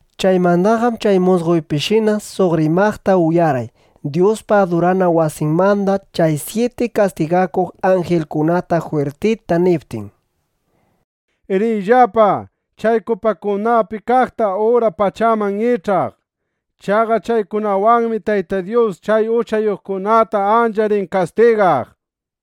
Chaymandaqam chay musqoypishina suq rimaqta uyarqay, Dyuspa adurana wasinmanda chay syiti kastigakuq anjilkunata jwirtita niptin: —Riyllapa, chay kupakunapi kaqta ura pachaman ich'aq. Chaqa chaykunawanmi Tayta Dyus chay uchayuqkunata ancha rin kastigaq, nishpa.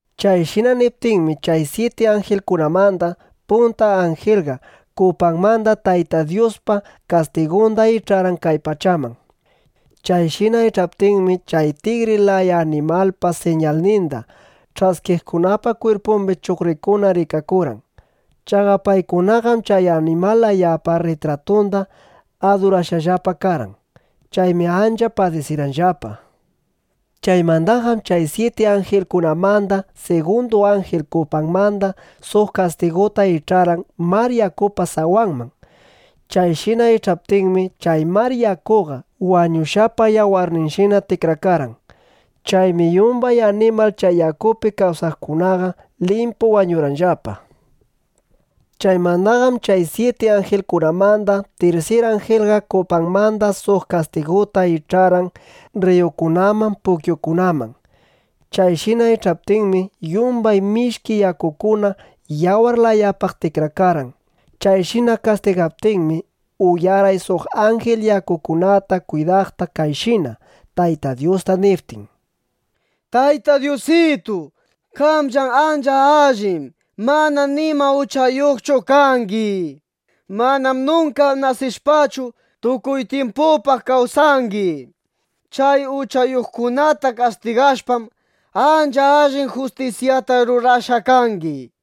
Chayshina niptinmi, chay syiti anjilkunamanda punta anjilqa kupanmanda Tayta Dyuspa kastigunda ich'arqan kay pachaman. Chayshina ich'aptinmi, chay tigri laya animalpa siñalninda ch'askiqkunapa kwirpumbi chuqrikuna rikakurqan. Chaqa paykunaqam chay animal layapa rritratunda adurashqallapa karqan. Chaymi ancha padisirqanllapa. Chaymandaqam chay syiti anjilkunamanda sigundu anjil kupanmanda suq kastiguta ich'arqan mar yakupa sawanman. Chayshina ich'aptinmi, chay mar yakuqa wañushqapa yawarninshina tikrakarqan. Chaymi yumbay animal chay yakupi kawsaqkunaqa limpu wañurqanllapa. Chaymandaqam chay syiti anjilkunamanda tirsir anjilqa kupanmanda suq kastiguta ich'arqan rriyukunaman, pukyukunaman. Chayshina ich'aptinmi, yumbay mishki yakukuna yawar layapaq tikrakarqan. Chayshina kastigaptinmi, uyarqay suq anjil yakukunata kwidaqta kayshina Tayta Dyusta niptin: —Tayta Dyusitu, qamllam ancha allin, mana nima uchayuqchu kangi. Manam nunka nasishpachu, tukuy tyimpupaq kawsangi. Chay uchayuqkunata kastigashpam, ancha allin justisyata rurashqa kangi.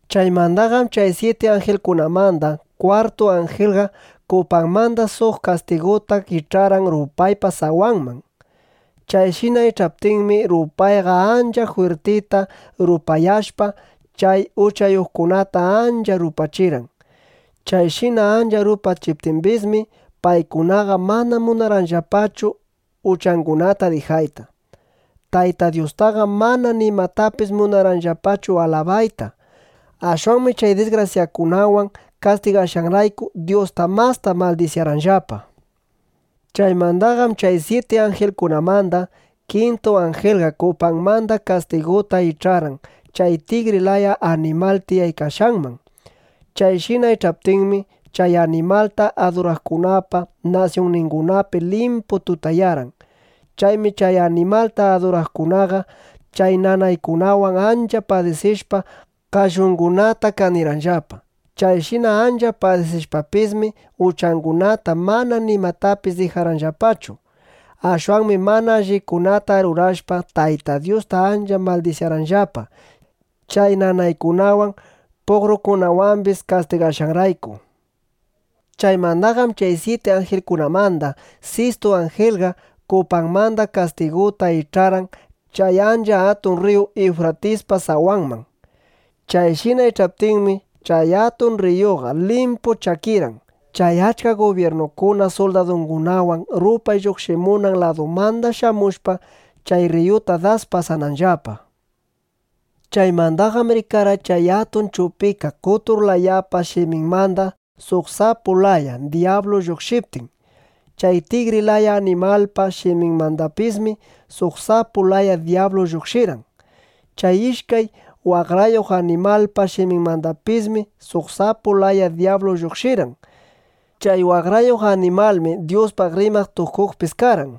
Chaymandaqam chay syiti anjilkunamanda kwartu anjilqa kupanmanda suq kastiguta ich'arqan rupaypa sawanman. Chayshina ich'aptinmi, rupayqa ancha jwirtita rupayashpa, chay uchayuqkunata ancha rupachirqan. Chayshina ancha rupachiptimbismi, paykunaqa mana munarqanllapachu uchangunata dijayta. Tayta Dyustaqam mana nimatapis munarqanllapachu alabayta. Ashwanmi chay disgrasyakunawan kastigashqanrayku, Dyusta masta maldisyarqanllapa. Chaymandaqam chay syiti anjilkunamanda kintu anjilqa kupanmanda kastiguta ich'arqan chay tigri laya animal tiyaykashqanman. Chayshina ich'aptinmi, chay animalta aduraqkunapa nasyunningunapi limpu tutayarqan. Chaymi chay animalta aduraqkunaqa chay nanaykunawan ancha padisishpa, qallungunata kanirqanllapa. Chayshina ancha padisishpapismi, uchangunata mana nimatapis dijarqanllapachu. Ashwanmi mana allikunata rurashpa, Tayta Dyusta ancha maldisyarqanllapa, chay nanaykunawan, puqrukunawambis kastigashqanrayku. Chaymandaqam chay syiti anjilkunamanda sistu anjilqa kupanmanda kastiguta ich'arqan chay ancha atun rriyu Iwfratispa sawanman. Chayshina ich'aptinmi, chay atun rriyuqa limpu chakirqan, chay achka gubyirnukuna suldadungunawan rupay lluqshimunan ladumanda shamushpa, chay rriyuta das pasananllapa. Chaymandaqam rikarqay chay atun chupika qotur layapa shiminmanda suq sapu laya dyablu lluqshiptin. Chay tigri laya animalpa shiminmandapismi suq sapu laya dyablu lluqshirqan. Chay ishkay waqrayuq animalpa shiminmandapismi suq sapu laya dyablu lluqshirqan. Chay waqrayuq animalmi Dyuspaq rimaq tukuqpis karqan.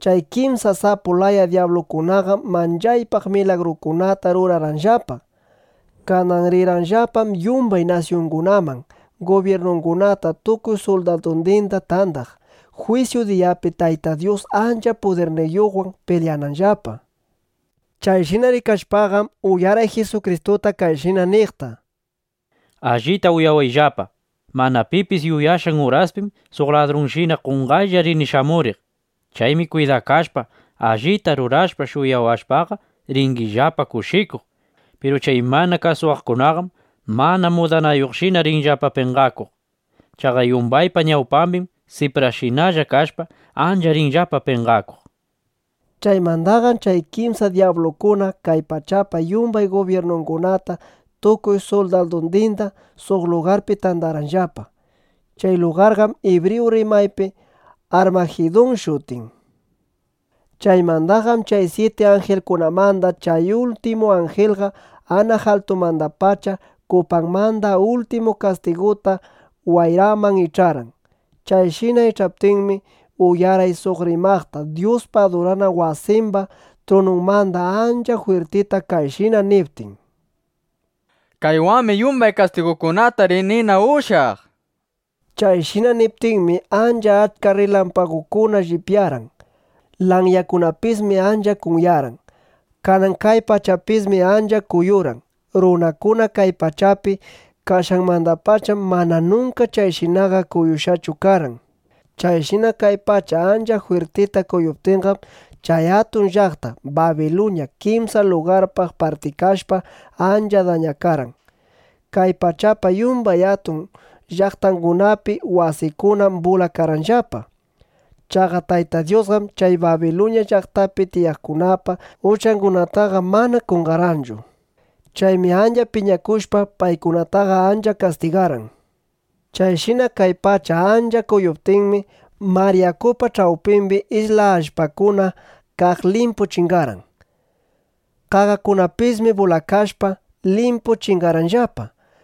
Chay kimsa sapu laya dyablukunaqam manchaypaq milagrukunata rurarqanllapa. Kanan rirqanllapam yumbay nasyungunaman, gubyirnungunata tukuy suldadundinda tandaq, jwisyu diyapi Tayta Dyus ancha pudirniyuqwan pilyananllapa. Chayshina rikashpaqam, uyarqay Jisukristuta, kayshina niqta: —Allita uyawayllapa. Mana pipis yuyashqan uraspim suq ladrunshina qonqaylla rini shamuriq. Chaymi kwidakashpa, allita rurashpa shuyawashpaqa, ringillapa kushikuq. Piru chay mana kasuwaqkunaqam mana mudanayuqshina rinllapa penqakuq. Chaqa yumbaypa ñawpambim siprallashina kashpa, ancha rinllapa penqakuq, nishpa. Chaymandaqam chay kimsa dyablukuna kay pachapa yumbay gubyirnungunata tukuy suldadundinda suq lugarpi tandarqanllapa. Chay lugarqam ibriyu rimaypi Armajidun shutin. Chaymandaqam chay syiti anjilkunamanda chay ultimu anjilqa anaq altumandapacha kupanmanda ultimu kastiguta wayraman ich'arqan. Chayshina ich'aptinmi, uyarqay suq rimaqta Dyuspa adurana wasimba trununmanda ancha jwirtita kayshina niptin: —Kaywanmi yumbay kastigukunata rinina ushyaq, nishpa. Chayshina niptinmi, ancha achka rrilampagukuna llipyarqan. Lanyakunapismi ancha kunyarqan. Kanan kay pachapismi ancha kuyurqan. Runakuna kay pachapi kashqanmandapacham mana nunka chayshinaqa kuyushqachu karqan. Chayshina kay pacha ancha jwirtita kuyuptinqam, chay atun llaqta Babiluña kimsa lugarpaq partikashpa, ancha dañakarqan. Kay pachapa yumbay atun llaqtangunapi wasikunam bulakarqanllapa. Chaqa Tayta Dyusqam chay Babiluña llaqtapi tiyaqkunapa uchangunataqa mana qonqarqanchu. Chaymi ancha piñakushpa, paykunataqa ancha kastigarqan. Chayshina kay pacha ancha kuyuptinmi, mar yakupa ch'awpimbi isla allpakuna kaq limpu chingarqan. Qaqakunapismi bulakashpa, limpu chingarqanllapa.